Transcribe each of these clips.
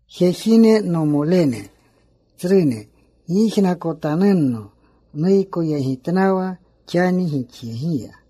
“Jejine, nomolene, tsrune, gyijnakotanunno. Nuykoyegitnawa xani gixyegiya.”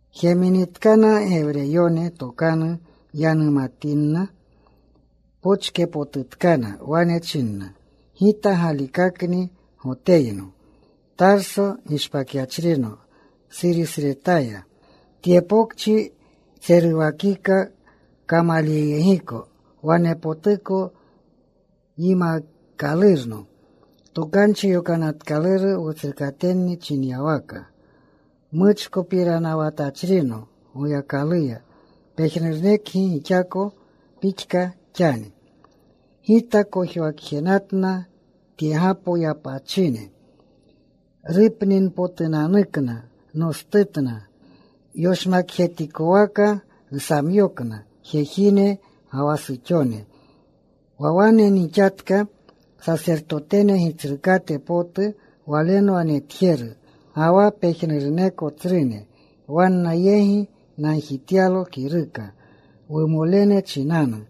Jeminitkana Gewreyone tokanu yanumatinna, pochkepotutkana. Wane china, “Gita galikakni Goteyno. Tarso gishpakyachrino Surisyasretaya. Tye pokchi ntseruwakika Kamalyoyegiko. Wanepotuko yimaakalurno Tokanchi Yokanatkaluru wutsrukatenni chinyawaka. Muchkopiranawatachrino Goyakaluya, pejnurunekgi gixako pixka xani. Gita kojwakjenatna tyegapo yapachine rupninpotunanukna. Nostutna. Yoshmakjetikowaka nsamyokna jejine ga wa suxone. Wa wane nixatka sasertotene gitsrukate potu walenwa netjeru, ga wa pejnuruneko tsrune. Wanna yegi nagjityalo kiruka wumolene chinanu.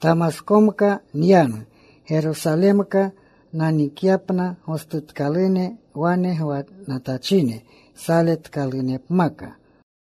Tamaskomka nyanu, Gerosalemka nanikyapna gostutkalune wane gwanatachine saletkalunepmaka.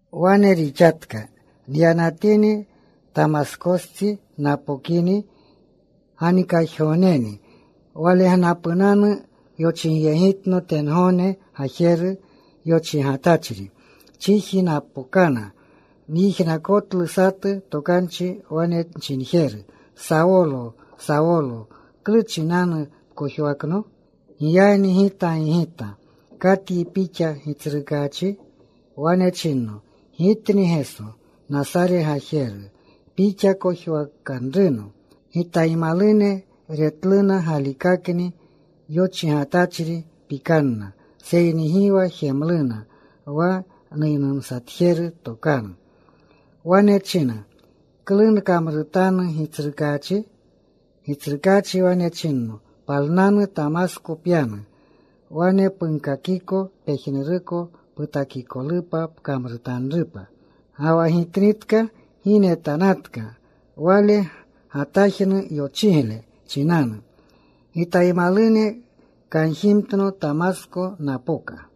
“Wane rixatka, nyanatini, Tamaskostsi napokini, ganikajgogneni walegnapunanu yochigyegitno tengogne gajeru yochigatachri. Chiji napokana. Nyijnakotlu satu tokanchi wane nchinjeru, ‘Sawolo, Sawolo, ¿klu chinanu pkojwakno?’ “Giyagni gita gigita, ‘¿Katyi Pixa, Gitsrukaachi?’ “Wane chinno, ‘Gitni Geso, Nasare gajeru, pixa kojwakanruno.’ Gitaymalune retluna galikakni yochigatachri. Pikanna. Seyni gi wa jemluna wa nuynumsatjeru tokanu. “Wane nchina, ‘¿Klu nkamrutanu, Gitsrukaachi?’ “Gitsrukaachi wane chinno, ‘Palnanu. Tamasko pyanu. Wane punkakiko pejnuruko putakikolupa pkamrutanrupa.’ Ga wa gitnitka gi netanatka wale gatajnu yochigle chinanu. Gitaymalune kanjimtno. Tamasko napoka.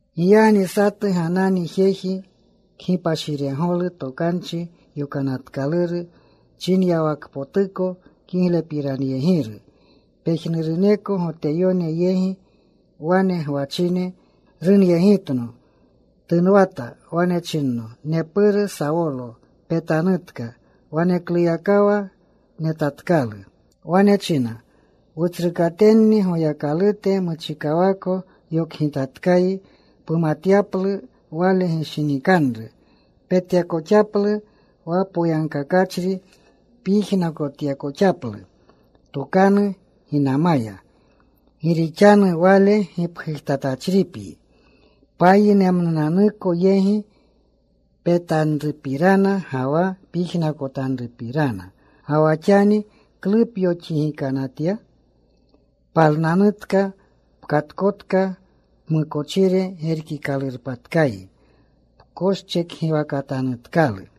“Giyagni satu Ganani, jeji kgipashiregolu Tokanchi Yokanatkaluru chinyawakpotuko, kiglepiranyegiru pejnuruneko Goteyone yegi wane gwachine. Runyegitno. Tunwata. Wane chinno, ‘Nepuru, Sawolo, petanutka.’ Wanekluyakawa netatkalu. “Wane china, ‘Wutsrukatenni Goyakalute muchikawako yokgitatkayi pumatyaplu Wale gishinikanru. Petyakoxaplu wa Poyagkakachri. Pyijnakotyakoxaplu tokanu ginamaya. Gi rixanu Wale gipgujtatachripyi payinmnunanuko yegi petanrupirana ga wa pyijnakotanrupirana. Ga wa xani ¿klu pyoxigikanatya? Palnanutka. Pkatkotka. Pmukochire gerkikalurpatkayi. Pkoschekgiwakatanutkalu.’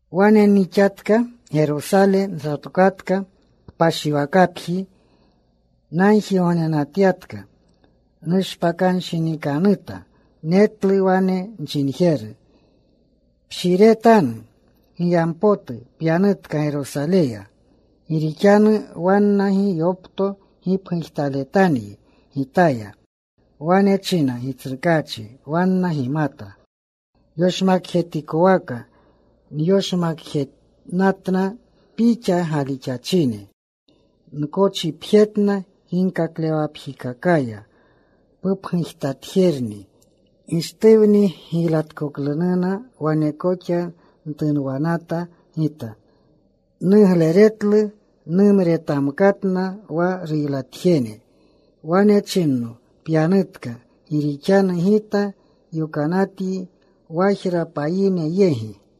“Wane nixatka. Gerosale nsatokatka. Kpashiwakapji nagjigognenatyatka. Nushpakanshinikanuta. Netlu wane nchinjeru, ‘Pshiretanu. Giyampotu pyanutka Gerosaleya. Gi rixanu wanna gi yopto gipgujtaletanyi Gitaya.’ “Wane nchina, ‘Gitsrukaachi, wanna gimata yoshmakjetikwaka nyoshmakjenatna Pixa galixachine. Nkochipjetna ginkaklewakapjikakaya. Pupgujtatjerni Gishtuwni giylatkoklununa wane koxa ntunwanata gita. Nugleretlu. Numretamkatna wa ruylatjene.’ “Wane chinno, ‘Pyanutka. Gi rixanu Gita yokanatanyi wajra payine yegi.’”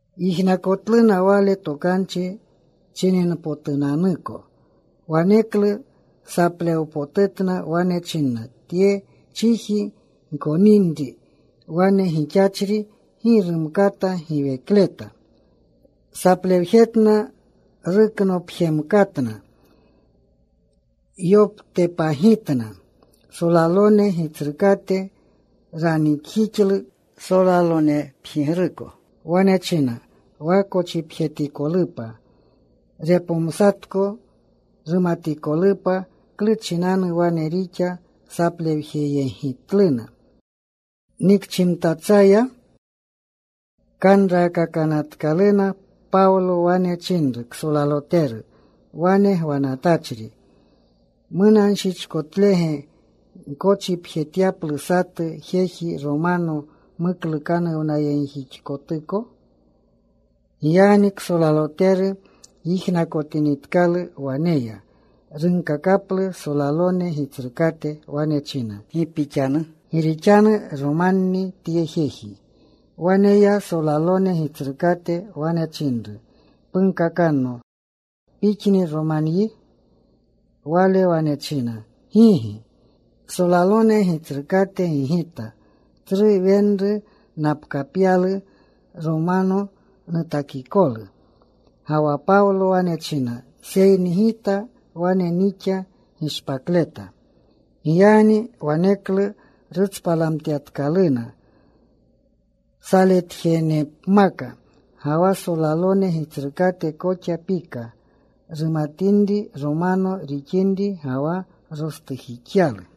Yijnakotluna wale tokanchi chininpotunanuko. Waneklu saplewpotutna. Wane chinna, “Tye chiji gkoninri wane gixachri. Gi rumkata giwekleta.” Saplewjetna. Ruknopxemkatna. Yoptepagitna. Solalone gitsrukate ranikjixlu solalonepjigruko. Wane china wa kochipjetikolupa, repomsatko, rumatikolupa klu chinanu wane rixa saplewjeyegitluna. Nikchimtatsaya kanraakakanatluna. Pawlo wane chinru ksolaloteru wane gwanatachri, “¿Munanshichkotlege gkochipjetyaplu satu jeji Romano muklukanuwnayegjixkotuko?” Giyagni ksolaloteru yijnakotinitkalu, wane ya. Runkakaplu solalone gitsrukate. Wane china, “¿Gi pixanu? Gi rixanu Romanni tye jeji.” Wane ya solalone gitsrukate. Wane chinru, “Punkakanno, ¿pixni Romanyi?” Wale wane china, “Gigi.” Solalone gitsrukate gigita, “Tsru wenru napkapyalu Romano nutakikolu.” Ga wa Pawlo wane china, “Seyni gita wane nixa gishpakleta.” Giyagni waneklu rutspalamtyatkaluna saletjenepmaka. Ga wa solalone gitsrukate koxa pika, rumatinri Romano rixinri, ga wa rostujixyalu.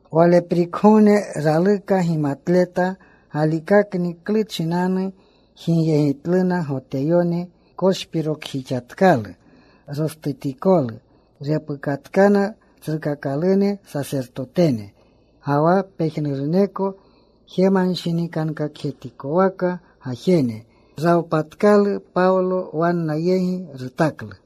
Waleprikgogne raluka gimatleta galikakni klu chinanu jigyegitluna Goteyone. Koshpirokjixatkalu rostutikolu. Repukatkana tsrukakalune sasertotene ga wa pejnuruneko jemanshinikankakjetikowaka gajene. Rawpatkalu Pawlo. Wanna yegi rutaklu.